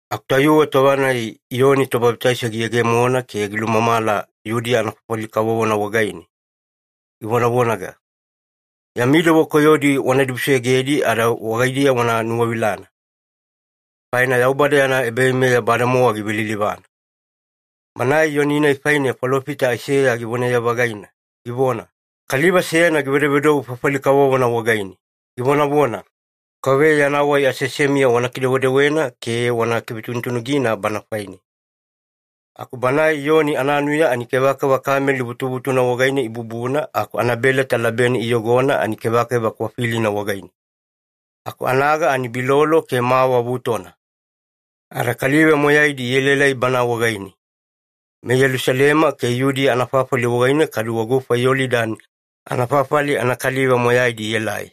Aku tayuwe tova-nai Iyoni Tobabitaiso giyegemona ke gilulumamala Yudiya anafafali kavovona wagaine, givonavonaga, “Yami dewa koyodi wana dibusoyogedi ada wagaidiya wana nuwavilana, faina Yaubada yana ebaveimeya bademowa givelilivana.” Banae Iyoni-nai faine falofita Aiseya givonaye-vagaina, givona, “Kaliva seyana givedovedou fafali kavovona wagaine, givonavona, ‘KAUVEYA yana wai aseasemiya wana kidewedewena ke wana kivetunutunugina Bana faine.’” Aku banae Iyoni ananuya ani kevakeva kameli vutuvutuna wagaine ibubuna, aku anabeleta labene giyogona ani kevakeva kwafilina wagaine. Aku anaga ani bilolo ke mawa vutona. Ada kaliva moyaidi ielaelai bana wagaine, meYelusalema ke Yudiya anafafali wagaine kaduwe gufa Yolidani anafafali anakaliva moyaidi ielai.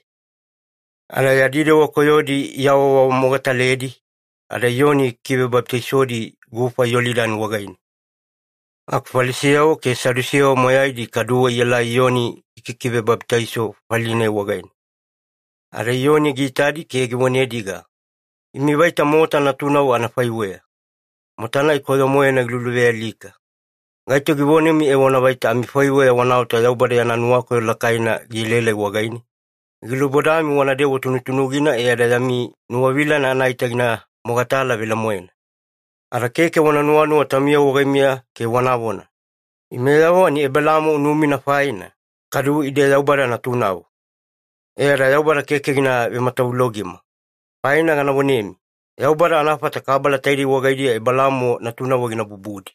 Ada yadi dewa koyodi iawaawamogataledi, ada Iyoni gikivebabitaisodi gufa Yolidani wagaine. Aku Falisiyavo ke Sadusiyavo moyaidi kaduwe ielai Iyoni gikikivebabitaiso fafali-nai wagaine. Ada Iyoni giitadi ke givonediga, “Imi vaita mota natunavo anafaiweya, mota-nai koyo-moena giluluvealika! Gaito givonemi evona vaita amifaiweya wanaota Yaubada yana nuwakoyo lakaina gielaelai wagaine? Gilubodami wanadewa tunutunugina e ada yami nuwavilana anaita gina mogatala velemoena. Ada keke wana nuwanuwa taumiyavo wagaimiya ke wanavona, ‘Imeyavo ani Ebelaamo unumina faina, kadu ide Yaubada natunavo. E ada Yaubada keke gina vematavulogima.’ Faina gana vonemi, Yaubada anafata kabala taidei wagaidiya Ebelaamo natunavo gina bubudi.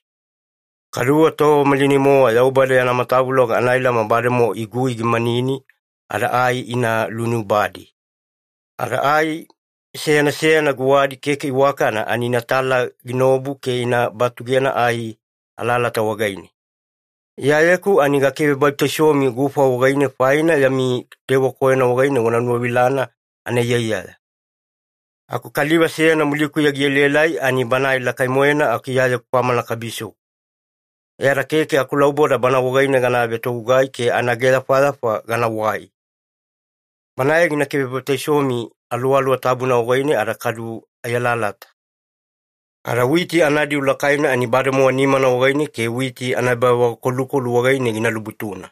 Kaduwe tova malinai-mowa Yaubada yana matavuloga anailama bademowa igui gimanini, ada ai ina luinubadi. Ada ai seyana seyana guwadi keke iwakana ani inatala ginaobu ke ina batugena ai alalata wagaine. Iyayeku ani gakivebabitaisomi gufa wagaine, faina yami dewa koyona wagaine wanuwavilana anaiyaiyaya. Aku kaliva seyana mulikuya gielaelai ani Banae lakai-moena aku Iyayeku kwamana kabisoku. E ada keke akulauboda Bana wagaine gana vetogugai ke anaageyafayafa ganawai. Banae gina kivebabitaisomi Aluwaluwa Tabuna wagaine ada kadu ai alalata. Ada witi anadiu lakaina ani bademowa nimana wagaine ke witi anaebavagakolukolu wagaine gina lubutuna.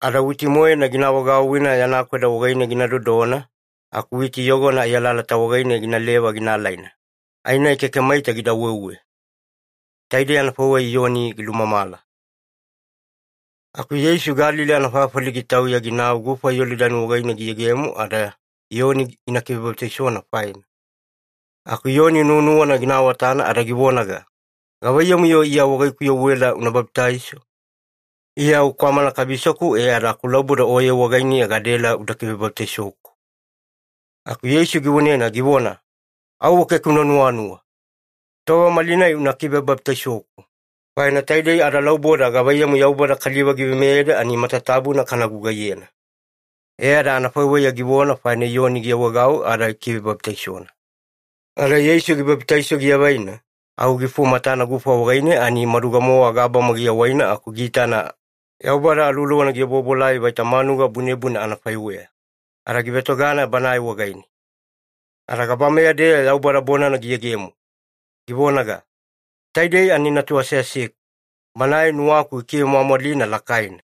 Ada witi-moena gina vagauwina yana kweda wagaine gina dodona, aku witi yogona ai alalata wagaine ginaleva gina alaina, ai-nai keke maita gida weuwe.” Taidei anafaiweya Iyoni gilumamala. Aku Yeisu Galili anafafali gitauya ginau gufa Yolidani wagaine giyegemo ada Iyoni gina kivebabitaisona faina. Aku Iyoni nuwanuwana gina awatana ada givonaga, “Gavaiyamu-yo Iya wagaikuya uela una babitaiso? Iya au kwamana kabisoku e ada akulauboda Oye wagainiya gadaela uda kivebabitaisoku.” Aku Yeisu givonena, givona, “Auwe keke una nuwanuwa. Tova malinai una kivebabitaisoku, faina taidei adalauboda gavaiyamu Yaubada kaliva giveimeyeda ani matatabuna kana gugaiyena.” E ada anafaiweya givona faina, Iyoni giawaegau ada gikivebabitaisona. Ada Yeisu gibabitaiso giavaina, au gifumatana gufa wagaine ani maduga-mowa gabama giawaina aku giitana Yaubada Aluwaluwana giobuobuelai vaita manuga bunebune anafaiweya, ada givetogana Banae wagaine. Ada gabameya-deya Yaubada bonana giyegemo, givonaga, “Taidei ani Natu aseaseku, Banae nuwaku gikivemwamwalina lakaina.”